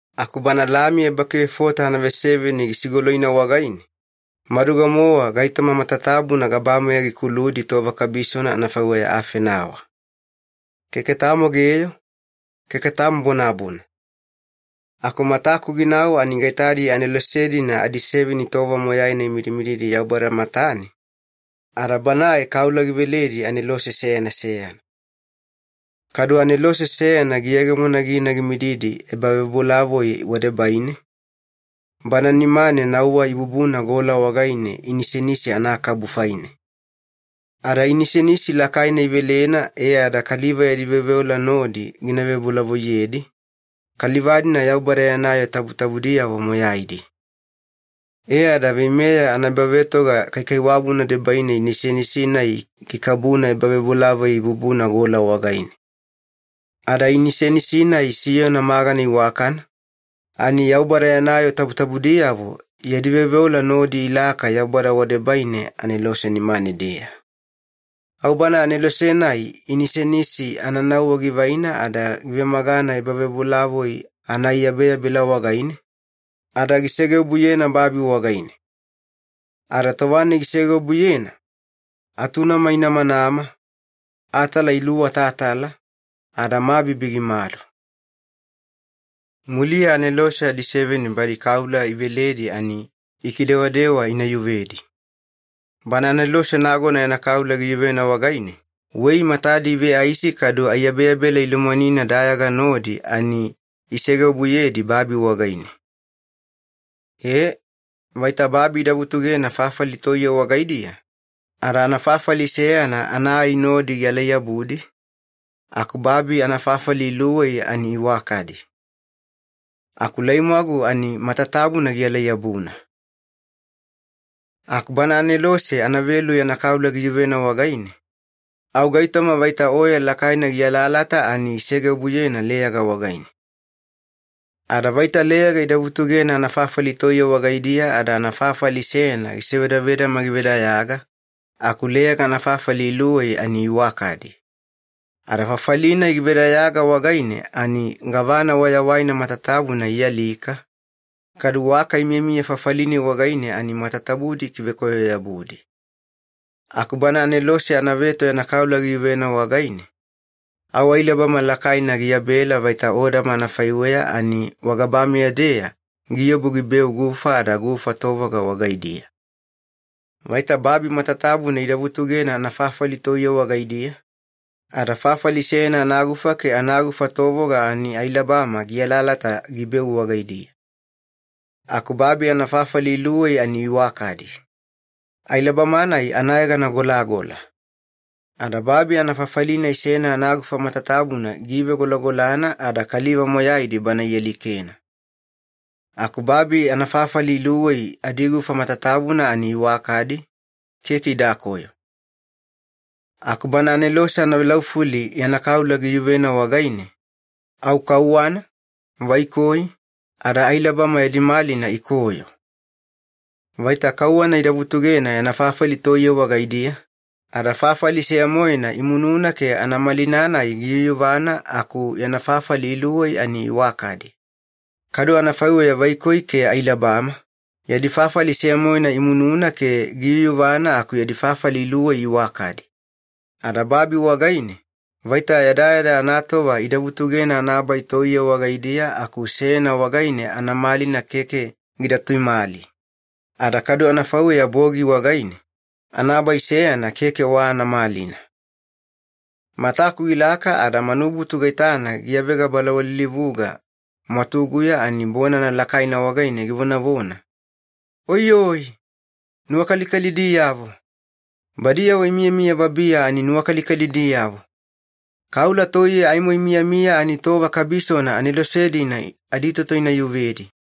Aku Bana Lami ebakivefota anaveseveni gisigoloina wagaine, maduga-mowa gaitoma matatabuna gabameya gikuludi tova kabisona anafaiweya afenawa. Keke tamo geyo, keke tamo bonabona. Aku mataku ginau ani gaitadi anelose-dina adiseveni tova moyaina imidimididi Yaubada matane, ada Banae kaula giveledi anelose seyana seyana. Kadu anelose seyana giyegemona gina gimididi ebavebolavoi wadebaine, bana nimane nauwa ibubuna gola wagaine inisenisi anaakabu faine. Ada inisenisi lakaina ivelena e ada kaliva yadi veoveola nodi gina vebolavoiyedi, kaliva-dina Yaubada yana yoo tabutabudiyavo moyaidi. E ada veimeya anaebavetoga kaikaiwabuna debaine inisenisi-nai gikabuna ebavebolavoi ibubuna gola wagaine. Ada inisenisi-nai siyona magana iwakana, ani Yaubada yana yoo tabutabudiyavo yadi veoveola nodi ilaka Yaubada wadebaine anelose nimane-deya. Au bana anelose-nai inisenisi ananauwa givaina ada givemagana ebavebolavoi anaaiyabeyabela wagaine, ada gisegeobuyena babi wagaine. Ada tova-nai gisegeobuyena, atunama inamanama, atala iluwatatala, ada mabibi gimadu. Muliya anelose adiseveni badi kaula iveledi ani ikidewadewa ina yuvedi. Bana anelose nagona yana kaula giyuvena wagaine, wei matadi iveaisi kadu aiyabeyabela ilomwanina dayaga nodi ani isegeobuyedi babi wagaine. Ee, vaita babi ida vutugena fafali toiye wagaidiya, ada anafafali seyana ana ai nodi gialai-yabudi, aku babi anafafali iluwei ani iwakadi. Aku laimwagu ani matatabuna gialai-yabuna. Aku bana anelose anavelu yana kaula giyuvena wagaine, au gaitoma vaita oya lakaina gialaalata ani isegeobuyena leyaga wagaine. Ada vaita leyaga ida vutugena anafafali toiye wagaidiya ada anafafali seyana gisevadavedama givedayaga, aku leyaga anafafali iluwei ani iwakadi. Ada fafali-nai givedayaga wagaine ani gavana wayawaina matatabuna ialika, kadu waka imiyamiya fafali-nai wagaine ani matatabudi ikivekoyo-yabudi. Aku bana anelose anaveto yana kaula giyuvena wagaine, au ailabama lakaina giyabela vaita odama anafaiweya ani wagabameya-deya giobu gibeu gufa ada gufa tovoga wagaidiya. Vaita babi matatabuna ida vutugena anafafali toiye wagaidiya, ada fafali seyana anagufa ke anagufa tovoga ani ailabama gialaalata gibeu wagaidiya. Aku babi anafafali iluwei ani iwakadi. Ailabama-nai anayegana ‘Golagola’. Ada babi anafafali-nai seyana anagufa matatabuna giivegolagolana ada kaliva moyaidi bana ialikena. Aku babi anafafali iluwei adigufa matatabuna ani iwakadi, keke idakoyo. Aku bana anelose anavelaufuli yana kaula giyuvena wagaine, au kauwana, vaikoi, ada ailabama yadi malina ikoyo. Vaita kauwana ida vutugena yana fafali toiye wagaidiya, ada fafali seya-moena imununa ke anamalina-nai giyuyuvana aku yana fafali iluwei ani iwakadi. Kadu anafaiweya vaikoi ke ailabama, yadi fafali seya-moena imununa ke giyuyuvana aku yadi fafali iluwei iwakadi. Ada babi wagaine, vaita yadayada anatova ida vutugena anabai toiye wagaidiya aku seyana wagaine anamalina keke gida tuimali. Ada kadu anafaiweya bogi wagaine, anabai seyana keke wa anamalina. Mataku gilaka ada manubutu gaitana giyavega balawaliwalilivuga mwatuguya ani bonana lakaina wagaine givonavona, “Oiyoi! Nuwakalikalidiyavo! Badiyavo imiyamiya babiya ani nuwakalikalidiyavo! Kaula toiye aimo imiyamiya ani tova kabisona anelose-dina aditoto ina yuvedi!”